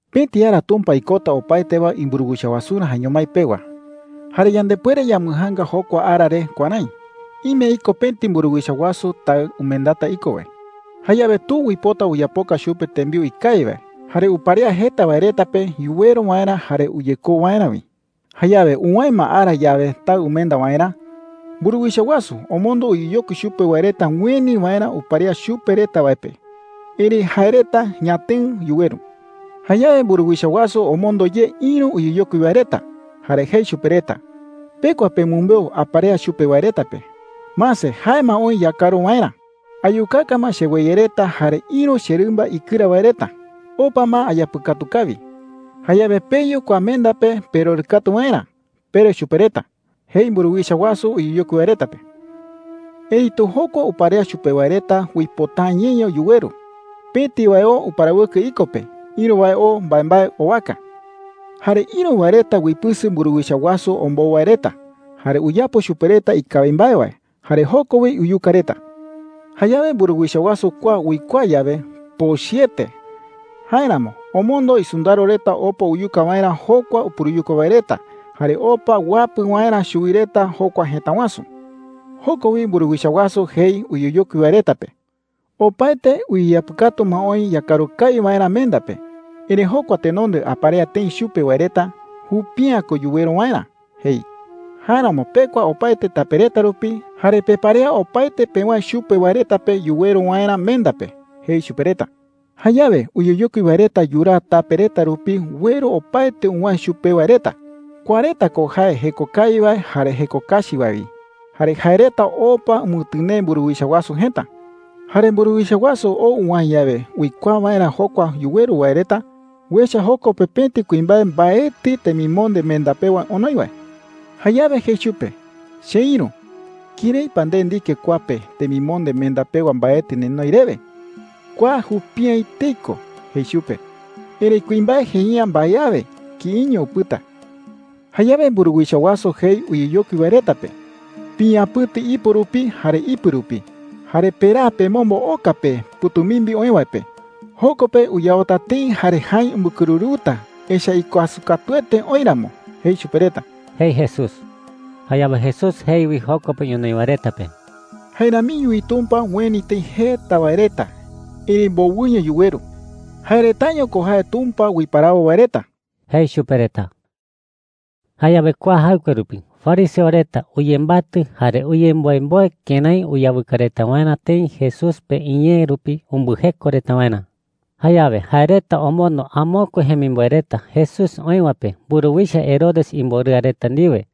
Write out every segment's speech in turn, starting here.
“Pëti ara Tumpa ikota opaete wae imburuwicha wasurä jaeño mái pewa. Jare yandepuere yambɨjaanga jokua ara re kuärái: Ime iko pëti mburuwicha wasu taɨ umendata iko wae. Jayawe tu uipota uyapoka chupe tembiu ikawi wae, jare uparea jeta wae reta pe yuweru waerä jare uyekou waerä wi. Jayawe uwäe ma ara yawe taɨ umenda waerä, mburuwicha wasu omondo uyeyokui chupe wae reta ueni waerä uparea chupe reta wae pe. Erëi jae reta ñatëɨ yuweru,” jei. “Jayawe mburuwicha wasu omondo ye ïru uyeyokui wae reta. Jare jei chupe reta: ‘Pekua pemɨmbeu aparea chupe wae reta pe: ‘Mase, jae ma oï yakaru waerä. Ayukaka ma cheweye reta jare ïru cherɨmba ikɨra wae reta. Opa ma ayapɨkatu kawi. Jayawe peyu kua menda pe perorɨkatu waerä,’ pere chupe reta,’ jei mburuwicha wasu uyeyokui wae reta pe. “Erëitu jokua uparea chupe wae reta uipota’ä ñeño yuweru. Pëti wae oo uparawɨkɨ iko pe. Ïru wae oo mbaembae owaka. Jare ïru wae reta uipɨsɨ mburuwicha wasu ombou wae reta, jare uyapo chupe reta ikawi mbae wae, jare joko wi uyuka reta,” jei. “Jayawe mburuwicha wasu kua uikuaa yawe, pochɨete. Jáeramo omondo isɨndaro reta opa uyuka waerä jokua upuruyuka wae reta jare opa uapɨ waerä chuwi reta jokua jëta wasu,” jei. “Joko wi mburuwicha wasu jei uyeyokui wae reta pe: ‘Opaete uyeyapɨkatu ma oï yakaru kawi waerä menda pe. Erëi jokua tenonde aparea tëi chupe wae reta, jupi’ä ko yuweru waerä,’ jei. ‘Jáeramo pekua opaete tape reta rupi, jare peparea opaete pewäe chupe wae reta pe yuweru waerä menda pe,’ jei chupe reta,” jei. “Jayawe uyeyokui wae reta yuraa tape reta rupi ueru opaete uwäe chupe wae reta – kua reta ko jae jeko kawi wae jare jeko kachi wae wi. Jare jae reta opa umɨtɨnee mburuwicha wasu jëta,” jei. “Jare mburuwicha wasu ou uwäe yawe uikuaa waerä jokua yuweru wae reta, uecha joko pe pëti kuimbae mbaetɨ temimonde menda pewa onoi wae. Jayawe jei chupe: ‘Cheïru, ¿kërái pa nde ndike kua pe temimonde menda pewa mbaetɨ nenoi rewe? Kua jupi’ä etei ko,’ jei chupe. Erëi kuimbae jei’ä mbae awe. Kïiño upɨta,” jei Jesús. “Jayawe mburuwicha wasu jei uyeyokui wae reta pe: ‘Piñapɨ̈ti ipo rupi jare ipɨ rupi, jare peraa pemombo oka pe pɨ̈tumimbi oï wae pe. Joko pe uyaota tëi jare jäi umbɨkɨrɨrɨuta, echa’ä ikuasɨ katuete oï ramo,’ jei chupe reta,” jei Jesús. Jayawe Jesús jei wi joko pe ñonoï wae reta pe: “Jae ramiño wi Tumpa ueni tëi jeta wae reta, erëi mbowɨño yuweru. Jae retaño ko jae Tumpa uiparawo wae reta,” jei chupe reta. Jayawe kua jaɨkue rupi fariseo reta uyembatɨ, jare uyemboemboe kërái uyawɨka reta waerä tëi Jesús pe iñee rupi umbɨjeko reta waerä. Jayawe jae reta omondo amokue jemimboe reta Jesús oï wae pe mburuwicha Herodes imborɨa reta ndiwe.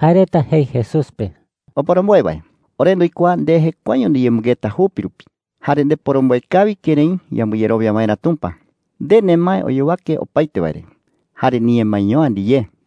Jae reta jei Jesús pe: “Oporomboe wae, ore nduikuaa nde jekuaeño ndiyemɨngeta jupi rupi jare ndeporomboe kawi kërái yambɨyerowia waerä Tumpa. Nde nemae oyowake opaete wae re jare niñemaeño’ä ndiyé,” jei reta.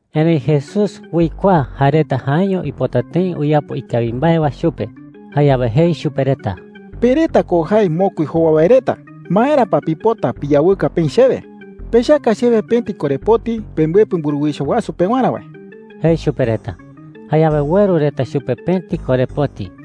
Erëi Jesús uikuaa jae reta jaeño uipota tëi uyapo ikawi mbae wae chupe. Jayawe jei chupe reta: “Pe reta ko jae mokui jowa wae reta. ¿Maera pa pipota piyawɨka peï chewe?” jei. “Pechaka chewe pëti korepoti pembɨepɨ mburuwicha wasu pewarä wae,” jei chupe reta. Jayawe ueru reta chupe pëti korepoti.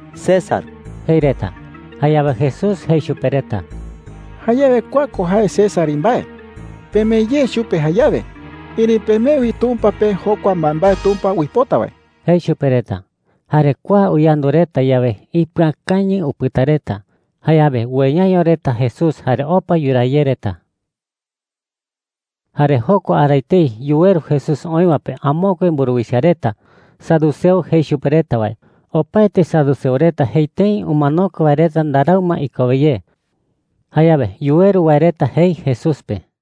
“César,” jei reta. Jayawe Jesús jei chupe reta: “Jayawe kua ko jae César imbae. Pemee ye chupe jayawe. Erëi pemee wi Tumpa pe jokua mbaembae Tumpa uipota wae,” jei chupe reta. Jare kua uyandu reta yawe, ipɨakañɨ upɨta reta. Jayawe ueyaño reta Jesús jare opa yuraa ye reta. Jare jokua ara etei yuweru Jesús oï wae pe amokue mburuwicha reta, saduceo jei chupe reta wae. Opaete saduceo reta jei tëi umanokue wae reta ndarau ma ikowe ye. Jayawe yuweru wae reta jei Jesús pe: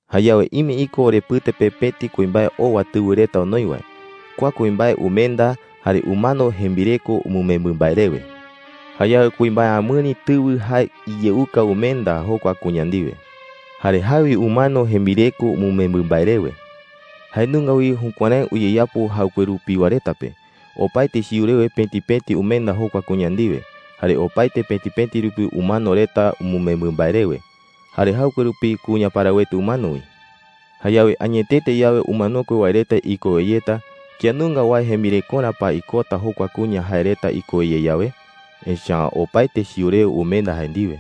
“Jayawe ime iko orepɨte pe pëti kuimbae owa tɨwɨ reta onoi wae. Kua kuimbae umenda, jare umano jembireko umɨmembɨ mbae rewe,” jei reta. “Jayawe kuimbae amɨri tɨwɨ jae iyeuka umenda jokua kuña ndiwe. Jare jae wi umano jembireko umɨmembɨ mbae rewe,” jei reta. “Jae nunga wi jukuärái uyeyapo jaɨkue rupiwa reta pe. Opaete chiu rewe pëti pëti umenda jokua kuña ndiwe, jare opaete pëti pëti rupi umano reta umɨmembɨ mbae rewe. Jare jaɨkue rupi kuña parawete umano wi,” jei reta. “Jayawe añetete yawe umanokue wae reta ikowe yeta, ¿kía nunga wae jembirekorä pa ikota jokua kuña jae reta ikowe ye yawe? Echa’ä opaete chiu rewe umenda jae ndiwe.”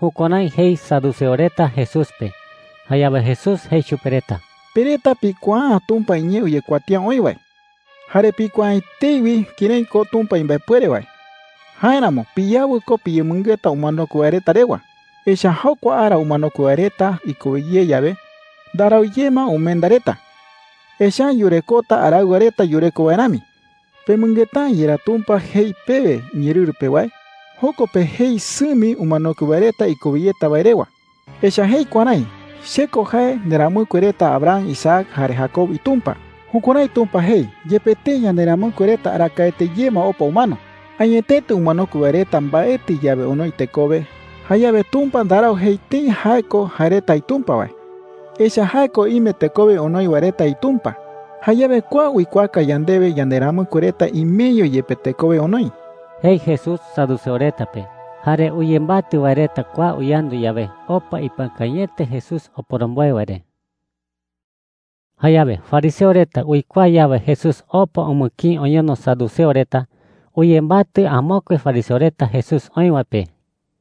Jukuärái jei saduceo reta Jesús pe. Jayawe Jesús jei chupe reta: “Pe reta pikuaa’ä Tumpa iñee uyekuatía oï wae, jare pikuaa’ä etei wi kërái ko Tumpa imbaepuere wae. Jáeramo piyawɨ ko piyemɨngeta umanokue wae reta rewa. Echa’ä jokua ara umanokue wae reta ikowe ye yawe, ndarau ye ma umenda reta. Echa’ä yurekota araɨwa reta yureko wae rami,” jei chupe reta. “¿Pemɨngeta’ä yerá Tumpa jei pewe iñeerɨru pe wae? Joko pe jei sɨmi umanokue wae reta ikowe yeta wae rewa. Echa’ä jei kuärái: ‘Che ko jae nderamɨkue reta Abraham, Isaac, jare Jacob iTumpa.’ Jukuärái Tumpa jei yepe tëi yanderamɨkue reta arakaete ye ma opa umano,” jei. “Añetete umanokue wae reta mbaetɨ yawe onoi tekowe, jayawe Tumpa ndarau jei tëi jae ko jae reta iTumpa wae, echa’ä jae ko ime tekowe onoi wae reta iTumpa,” jei. “Jayawe kua uikuaaka yandewe yanderamɨkue reta imeño yepe tekowe onoi,” jei Jesús saduceo reta pe. Jare uyembatɨ wae reta kua uyandu yawe, opa ipɨakañɨete Jesús oporomboe wae re. Jayawe fariseo reta uikuaa yawe Jesús opa umɨkïi oñono saduceo reta, uyembatɨ amokue fariseo reta Jesús oï wae pe.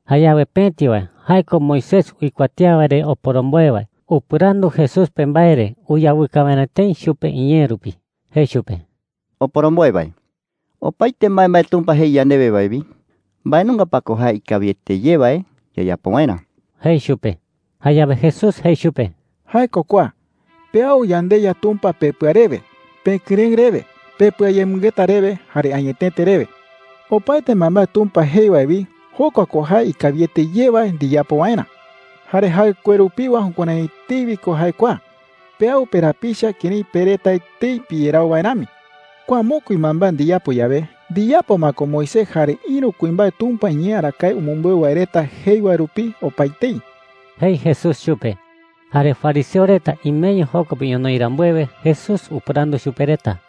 Jayawe pëti wae – jae ko Moisés uikuatía wae re oporomboe wae – upɨrandu Jesús pe mbae re uyawɨka waerä tëi chupe iñee rupi. Jei chupe: “Oporomboe wae, opaete mbaembae Tumpa jei yandewe wae wi, ¿mbae nunga pa ko jae ikawiete ye wae yayapo waerä?” jei chupe. Jayawe Jesús jei chupe: “Jae ko kua: ‘Peau yandeYa Tumpa pepɨa rewe, pekɨrëɨ rewe, pepɨayemɨngeta rewe, jare añetete rewe.’ Opaete mbaembae Tumpa jei wae wi, jokua ko jae ikawiete ye wae ndiyapo waerä,” jei chupe. “Jare jaɨkue rupiwa jukuärái etei wi ko jae kua: ‘Peau perapicha kërái pe reta etei piyerau wae rami.’ Kua mokui mbaembae ndiyapo yawe, ndiyapo ma ko Moisés jare ïru kuimbae Tumpa iñee arakae umɨmbeu wae reta jei wae rupi opaetei,” jei Jesús chupe. Jare fariseo reta imeño joko pe ñonoï rambuewe, Jesús upɨrandu chupe reta: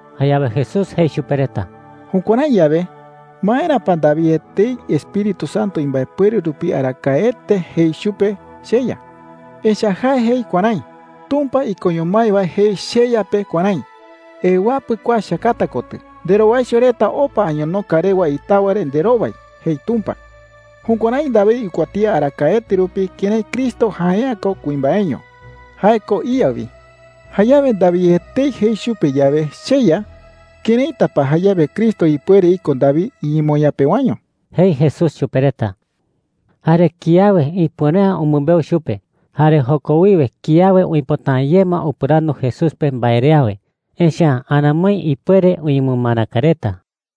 Jayawe Jesús jei chupe reta: “Jukuärái yawe, ¿maera pa David etei Espíritu Santo imbaepuere rupi arakaete jei chupe, ‘CheYa’? Echa’ä jae jei kuärái: ‘Tumpa ikoño mái wae jei cheYa pe kuärái: ‘Ewapɨ kua cheakata kotɨ, nderowaicho reta opa añonoka rewa itawa re nderowai,’ jei Tumpa.’ Jukuärái David uikuatía arakaete rupi kërái Cristo jae’ä ko kuimbaeño. Jae ko iYa wi. Jayawe David etei jei chupe yawe, ‘CheYa,’ ¿këraita pa jayawe Cristo ipuere iko David iñemoñaa pewaño?” jei Jesús chupe reta. Jare kiawe ipuere’ä umɨmbeu chupe. Jare joko wiwe kiawe uipota’ä ye ma upɨrandu Jesús pe mbae re awe, echa’ä aramoi ipuere uñemɨmaraka reta.